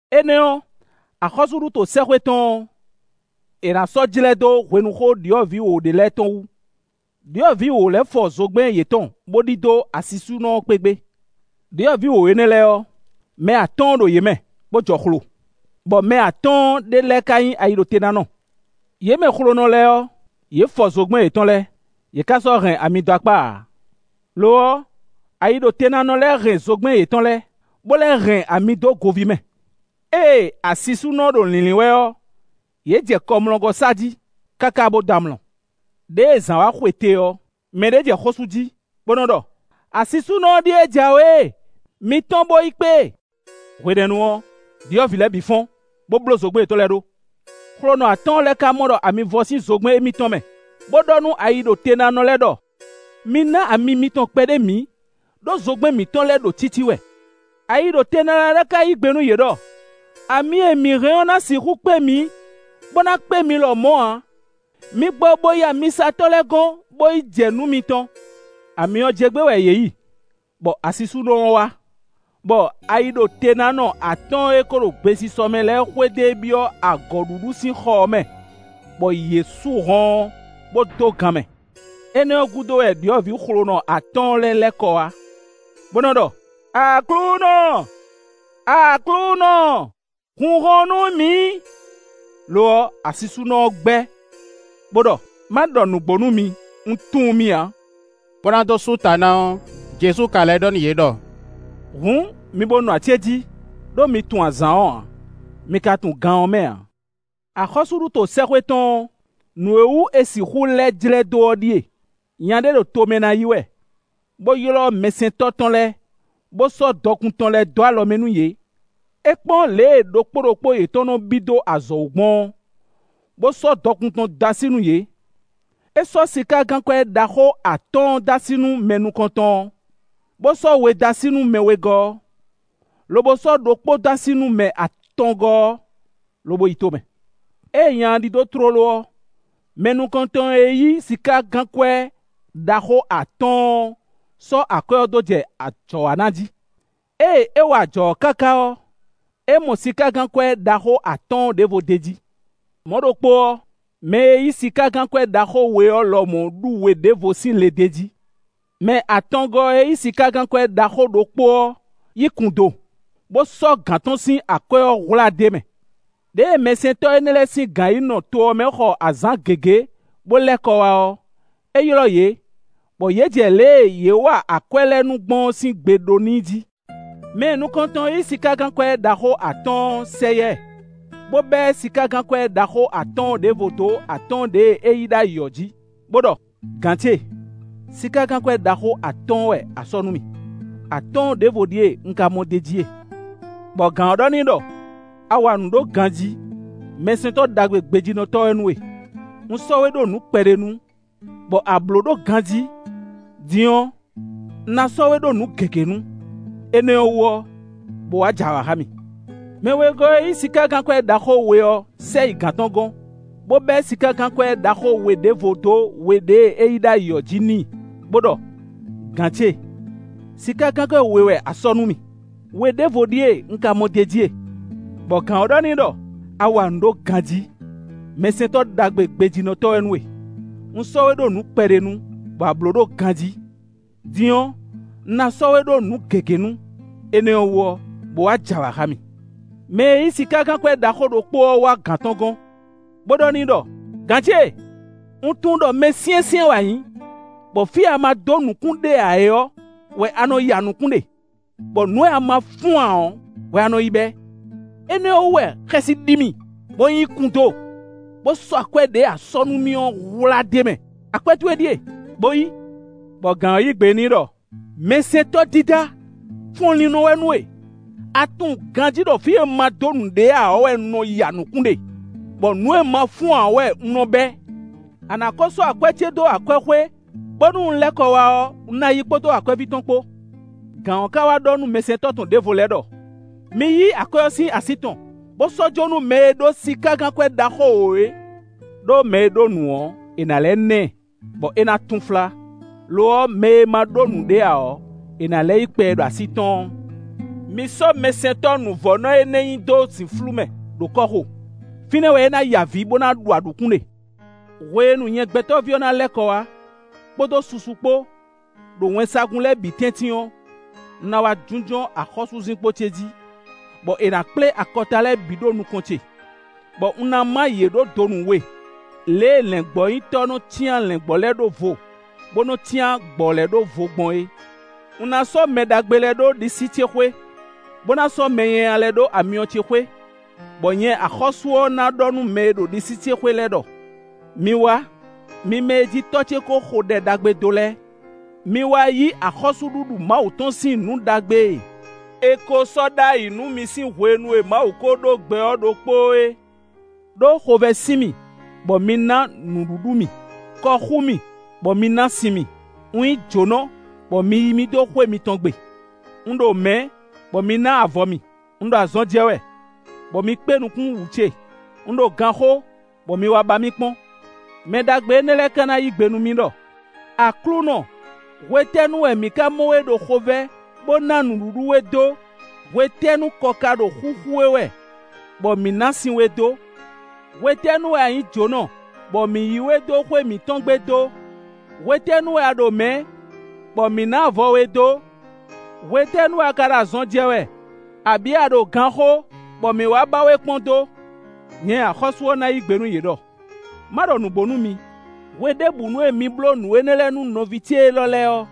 “Énɛ́ ɔ́, axɔ́súɖuto sɛ́xwé tɔn ɔ́, è nǎ sɔ́ jlɛ́ dó hwenuxó ɖyɔ̌vǐ wǒ ɖé lɛ́ɛ tɔn wú. Ɖyɔ̌vǐ wǒ lɛ́ɛ fɔ zogbɛ́n yětɔn bó ɖidó asisúnɔ ɔ́ kpé gbé. Ɖyɔ̌vǐ wǒ énɛ́ lɛ́ɛ ɔ́, mɛ atɔ́ɔ́n ɖo yě mɛ, bó jɔ xlo, bɔ mɛ atɔ́ɔ́n ɖě lɛ́ɛ ka nyí ayiɖotenánɔ. Yě mɛ xlonɔ lɛ́ɛ ɔ́, yě fɔ zogbɛ́n yětɔn lɛ́ɛ, yě ká sɔ́ hɛn ami dó akpá ǎ. Lo ɔ́, ayiɖotenánɔ lɛ́ɛ hɛn zogbɛ́n yětɔn lɛ́ɛ, bó lɛ́ hɛn ami dó goví mɛ. Ée asisúnɔ ɔ́ ɖo lǐnlín wɛ ɔ́, yě jɛ kɔmlɔgɔ́ sa jí, káká bó dɔ́ amlɔ. “Ɖěe zǎn wá xwete ɔ́, mɛɖé jɛ xó sú jí, bó nɔ́ ɖɔ: ‘Asisúnɔ ɔ́ ɖíe jǎwe e, mi tɔ́n bó yi kpé e!’ Hwenɛ́nu ɔ́, ɖyɔ̌vǐ lɛ́ɛ bǐ fɔ́n, bó bló zogbɛ́n yětɔn lɛ́ɛ ɖó. Xlonɔ atɔ́ɔ́n lɛ́ɛ ka mɔ ɖɔ ami vɔ sín zogbɛ́n émítɔn mɛ, bó ɖɔ nú ayiɖotenánɔ lɛ́ɛ ɖɔ: ‘Mi ná ami mitɔn kpɛɖé mǐ, ɖó zogbɛ́n mǐtɔn lɛ́ɛ ɖo cící wɛ.’ Ayiɖotenánɔ lɛ́ɛ ka yí gbe nú yě ɖɔ: ‘Ami e mǐ hɛn ɔ́ ná sixú kpé mǐ, bó ná kpé mi lɔmɔ̌ ǎ. Mi gbɔ bo yi amisatɔ́ lɛ́ɛ gɔ́n, bó yi jɛ nǔ mitɔn.’ Ami ɔ́ jɛ gbé wɛ yě yi, bɔ asisúnɔ ɔ́ wá, bɔ ayiɖotenánɔ atɔ́ɔ́n e kó ɖo gbesisɔ mɛ lɛ́ɛ xwedó e byɔ́ agɔ̌ɖuɖu sín xɔ ɔ́ mɛ, bɔ yě sú hɔn ɔ́, bó dó gan mɛ. Énɛ́ ɔ́ gúdo wɛ ɖyɔ̌vǐ xlonɔ atɔ́ɔ́n lɛ́ɛ lɛ́ kɔ wá, bó nɔ́ ɖɔ: ‘Aklúnɔ, aklúnɔ, hun hɔn nú mǐ!’ Lo ɔ́, asisúnɔ ɔ́ gbɛ́, bó ɖɔ: ‘Má ɖɔ nǔgbó nú mi, un tunwun mi ǎ.’” Bó ná dó sú ta ná ɔ́, Jezu ka lɛ́ ɖɔ nú yě ɖɔ: “Hǔn mi bo nɔ acéjí, ɖó mi tunwun azǎn ɔ́ ǎ, mi ka tunwun gan ɔ́ mɛ ǎ.” “Axɔ́súɖuto sɛ́xwé tɔn ɔ́, nǔ e wú è sixú lɛ́ jlɛ́ dó ɔ́ ɖíe: nya ɖé ɖo tomɛ ná yi wɛ, bó ylɔ́ mɛsɛntɔ́ tɔn lɛ́ɛ, bó sɔ́ dɔkun tɔn lɛ́ɛ dó alɔ mɛ nú yě. É kpɔ́n lě e ɖokpó ɖokpó yětɔn nɔ́ bí dó azɔ̌ wú gbɔn ɔ́, bó sɔ́ dɔkun tɔn dó así nú yě. É sɔ́ sikágankwɛ́ ɖaxó atɔ́ɔ́n dó así nú mɛ nukɔntɔn ɔ́, bó sɔ́ we dó así nú mɛ wegɔ́ ɔ́, lobo sɔ́ ɖokpó dó así nú mɛ atɔngɔ́ ɔ́, lobo yi to mɛ. Ée nya ɔ́ ɖidó tlóló ɔ́, mɛ nukɔntɔn e yí sikágankwɛ́ ɖaxó atɔ́ɔ́n ɔ́ sɔ́ akwɛ́ ɔ́ dó jɛ ajɔ wa ná jí. Ée é wa ajɔ ɔ́ káká ɔ́, é mɔ sikágankwɛ́ ɖaxó atɔ́ɔ́n ɖěvo d'é jí. Mɔ̌ ɖokpó ɔ́, mɛ e yí sikágankwɛ́ ɖaxó we ɔ́ lɔmɔ̌ ɖu we ɖěvo sín le d'é jí. Mɛ atɔngɔ́ ɔ́ e yí sikágankwɛ́ ɖaxó ɖokpó ɔ́ yi kun do, bó sɔ́ gǎn tɔn sín akwɛ́ ɔ́ hwlá d'é mɛ. “Ɖěe mɛsɛntɔ́ énɛ́ lɛ́ɛ sín gǎn yi nɔ to ɔ́ mɛ xɔ azǎn gěgé, bó lɛ́ kɔ wá ɔ́, é ylɔ́ yě, bɔ yě jɛ lě e yě wa akwɛ́ lɛ́ɛ nǔ gbɔn ɔ́ sín gbe ɖó n'i jí. Mɛ nukɔntɔn e yí sikágankwɛ́ ɖaxó atɔ́ɔ́n ɔ́ sɛ yá ɛ, bó bɛ́ sikágankwɛ́ ɖaxó atɔ́ɔ́n ɖěvo dó atɔ́ɔ́n ɖěe é yí ɖ'ayǐ ɔ́ jí, bó ɖɔ: ‘Gǎn ce, sikágankwɛ́ ɖaxó atɔ́ɔ́n wɛ a sɔ́ nú mì; atɔ́ɔ́n ɖěvo ɖíe un ka mɔ d'é jí e.’ Bɔ gǎn ɔ́ ɖɔ n'i ɖɔ: ‘A wa nǔ ɖó ganjí; mɛsɛntɔ́ ɖagbe gbejínɔtɔ́ wɛ nú we. Un sɔ́ we ɖó nǔ kpɛɖé nu, bɔ a blǒ ɖó ganjí; din ɔ́, un ná sɔ́ we ɖó nǔ gěgé nu. Énɛ́ ɔ́ wú ɔ́, bo wá j'awǎ xá mì.’ Mɛ wegɔ́ ɔ́ e yí sikágankwɛ́ ɖaxó we ɔ́ sɛ yi gǎn tɔn gɔ́n, bó bɛ́ sikágankwɛ́ ɖaxó we ɖěvo dó we ɖěe é yí ɖ'ayǐ ɔ́ jí n'i, bó ɖɔ: ‘Gǎn ce, sikágankwɛ́ we wɛ a sɔ́ nú mì; we ɖěvo ɖíe un ka mɔ d'é jí e.’ Bɔ gǎn ɔ́ ɖɔ n'i ɖɔ: ‘A wa nǔ ɖó ganjí; mɛsɛntɔ́ ɖagbe gbejínɔtɔ́ wɛ nú we. Un sɔ́ we ɖó nǔ kpɛɖé nu, bɔ a blǒ ɖó ganjí; din ɔ́, un ná sɔ́ we ɖó nǔ gěgé nu. Énɛ́ ɔ́ wú ɔ́, bó wá j'awǎ xá mì.’ Mɛ e yí sikágankwɛ́ ɖaxó ɖokpó ɔ́ wá gǎn tɔn gɔ́n, bó ɖɔ n'i ɖɔ: ‘Gǎn ce, un tunwun ɖɔ mɛ syɛ́nsyɛ́n wɛ a nyǐ, bɔ fí e a ma dó nǔkún ɖe ǎ ɔ́ wɛ a nɔ ya nǔkún ɖe; bɔ nǔ e a ma fún ǎ ɔ́ wɛ a nɔ yi bɛ́. Énɛ́ ɔ́ wú wɛ xɛsi ɖi mì, bɔ un yi kun do, bó sɔ́ akwɛ́ ɖěe a sɔ́ nú mì ɔ́ hwlá d'é mɛ. Akwɛ́ towe ɖíe, bo yí.’ Bɔ gǎn ɔ́ yí gbe n'i ɖɔ: ‘Mɛsɛntɔ́ dídá fɔnlínnɔ wɛ nú we. A tunwun ganjí ɖɔ fí e un ma dó nǔ ɖe ǎ ɔ́ wɛ un nɔ ya nǔkún ɖe; bɔ nǔ e un ma fún ǎ ɔ́ wɛ un nɔ bɛ́. A nǎ kó sɔ́ akwɛ́ ce dó akwɛ́xwé, bónú un lɛ́ kɔ wá ɔ́, un ná yí kpódó akwɛ́ví tɔn kpó.’ Gǎn ɔ́ ka wá ɖɔ nú mɛsɛntɔ́ tɔn ɖěvo lɛ́ɛ ɖɔ: ‘Mi yí akwɛ́ ɔ́ sín así tɔn, bó sɔ́ jó nú mɛ e ɖó sikágankwɛ́ ɖaxó wǒ é. Ɖó mɛ e ɖó nǔ ɔ́, è nǎ lɛ́ ná ɛ, bɔ é ná túnflá; lo ɔ́, mɛ e ma ɖó nǔɖé ǎ ɔ́, è nǎ lɛ́ yí kpɛ e ɖo así tɔn ɔ́. Mi sɔ́ mɛsɛntɔ́ nǔvɔ́nɔ énɛ́ nyi dó zǐnflú mɛ ɖo kɔ́xo; fínɛ́ wɛ é ná ya avǐ, bó ná ɖu aɖǔkún ɖe.’” “Hwenu nyɛ Gbɛtɔ́ví ɔ́ ná lɛ́ kɔ wá, kpódó susu kpó, ɖo wɛnsagun lɛ́ɛ bǐ tɛ́ntin ɔ́, un ná wá jínjɔ́n axɔ́súzinkpo ce jí, bɔ è nǎ kplé akɔta lɛ́ɛ bǐ ɖó nukɔn ce, bɔ un ná má yě ɖó donu we, lě e lɛ̌ngbɔ́nyitɔ́ nɔ́ cyán lɛ̌ngbɔ́ lɛ́ɛ ɖó vo, bó nɔ́ cyán gbɔ̌ lɛ́ɛ ɖó vo gbɔn é. Un ná sɔ́ mɛ ɖagbe lɛ́ɛ ɖó ɖisí ce xwé, bó ná sɔ́ mɛ nyanya lɛ́ɛ ɖó amyɔ ce xwé, bɔ nyɛ axɔ́sú ɔ́ ná ɖɔ nú mɛ e ɖo ɖisí ce xwé lɛ́ɛ ɖɔ: ‘Mi wá, mi mɛ e jí Tɔ́ ce ko xo ɖɛ ɖagbe dó lɛ́ɛ. Mi wá yí axɔ́súɖuɖu Mawu tɔn sín nǔ ɖagbe e è ko sɔ́ ɖ'ayǐ nú mi sín hwenu e Mawu ko ɖó gbɛ ɔ́ ɖokpóó é. Ɖó xovɛ́ sin mì, bɔ mi ná nǔɖuɖu mì. Kɔ xú mì, bɔ mi ná sin mì. Un nyí jǒnɔ, bɔ mi yí mì dó xwé mitɔn gbe. Un ɖo mɛ̌, bɔ mi ná avɔ mì. Un ɖo azɔn jɛ wɛ, bɔ mi kpé nukún wǔ ce. Un ɖo ganxó, bɔ mi wá ba mì kpɔ́n.’ Mɛ ɖagbe énɛ́ lɛ́ɛ ká ná yí gbe nú mì ɖɔ: ‘Aklúnɔ, hwetɛ́nu wɛ mǐ ká mɔ we ɖo xovɛ́, bó ná nǔɖuɖu we dó? Hwetɛ́nu kɔ ka ɖo xúxú we wɛ, bɔ mǐ ná sin we dó? Hwetɛ́nu wɛ a nyǐ jǒnɔ, bɔ mǐ yí we dó xwé mǐtɔn gbe dó? Hwetɛ́nu wɛ a ɖo mɛ̌, bɔ mǐ ná avɔ we dó? Hwetɛ́nu wɛ a ka ɖo azɔn jɛ wɛ, abǐ a ɖo ganxó, bɔ mǐ wá ba we kpɔ́n dó?’ Nyɛ axɔ́sú ɔ́ ná yí gbe nú yě ɖɔ: ‘Má ɖɔ nǔgbó nú mi: hweɖěbǔnu e mi bló nǔ énɛ́ lɛ́ɛ nú nɔví ce élɔ́ lɛ́ɛ ɔ́,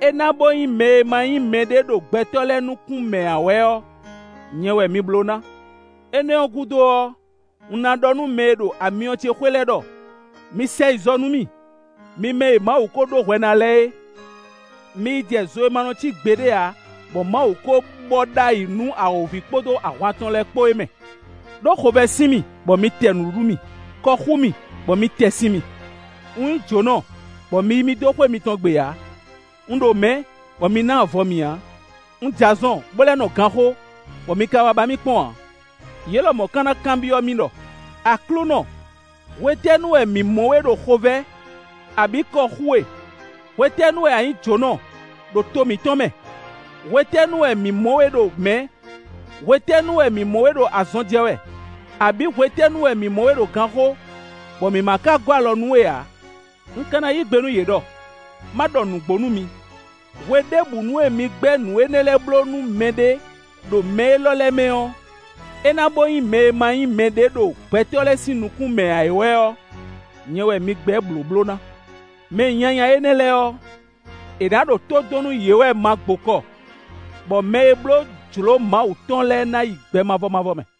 é ná bo nyí mɛ e ma nyí mɛ ɖé ɖo gbɛtɔ́ lɛ́ɛ nukún mɛ ǎ wɛ ɔ́, nyɛ wɛ mi bló ná.’ “Énɛ́ ɔ́ gúdo ɔ́, un ná ɖɔ nú mɛ e ɖo amyɔ ce xwé lɛ́ɛ ɖɔ: ‘Mi sɛ yi zɔ nú mì, mi mɛ e Mawu ko ɖó hwɛ ná lɛ́ɛ é, mi yi jɛ zo e ma nɔ cí gbeɖé ǎ, bɔ Mawu kó bɔ ɖ'ayǐ nú awǒvi kpódó ahwan tɔn lɛ́ɛ kpó é mɛ. Ɖó xovɛ́ sin mì, bɔ mi tɛ nǔɖuɖu mì; kɔ xú mì, bɔ mi tɛ sin mì. Un nyí jǒnɔ, bɔ mi yí mì dó xwé mitɔn gbe ǎ. Un ɖo mɛ̌, bɔ mi ná avɔ mì ǎ. Un jɛ azɔn, bo lɛ́ nɔ ganxó, bɔ mi ka wá ba mì kpɔ́n ǎ.’ Yě lɔmɔ̌ ka ná kanbyɔ́ mì ɖɔ: ‘Aklúnɔ, hwetɛ́nu wɛ mǐ mɔ we ɖo xovɛ́, abǐ kɔ xú we? Hwetɛ́nu wɛ a nyǐ jǒnɔ ɖo to mǐtɔn mɛ? Hwetɛ́nu wɛ mǐ mɔ we ɖo mɛ̌? Hwetɛ́nu wɛ mǐ mɔ we ɖo azɔn jɛ wɛ, abǐ hwetɛ́nu wɛ mǐ mɔ we ɖo ganxó, bɔ mǐ ma ka gɔ́ alɔ nú we ǎ?’ Un ka ná yí gbe nú yě ɖɔ: ‘Má ɖɔ nǔgbó nú mi, hweɖěbǔnu e mi gbɛ́ nǔ énɛ́ lɛ́ɛ bló nú mɛɖé ɖo mɛ élɔ́ lɛ́ɛ mɛ ɔ́, é ná bó nyí mɛ e ma nyí mɛɖé ɖo gbɛtɔ́ lɛ́ɛ sín nukún mɛ ǎ ɔ́ wɛ ɔ́, nyɛ wɛ mi gbɛ́ blǒbló ná.’ Mɛ nyanya énɛ́ lɛ́ɛ ɔ́, è nǎ ɖo tó dɔn nú yě wɛ ma gbokɔ, bɔ mɛ e bló jlǒ Mawu tɔn lɛ́ɛ ná yi gbɛ mavɔ mavɔ mɛ.”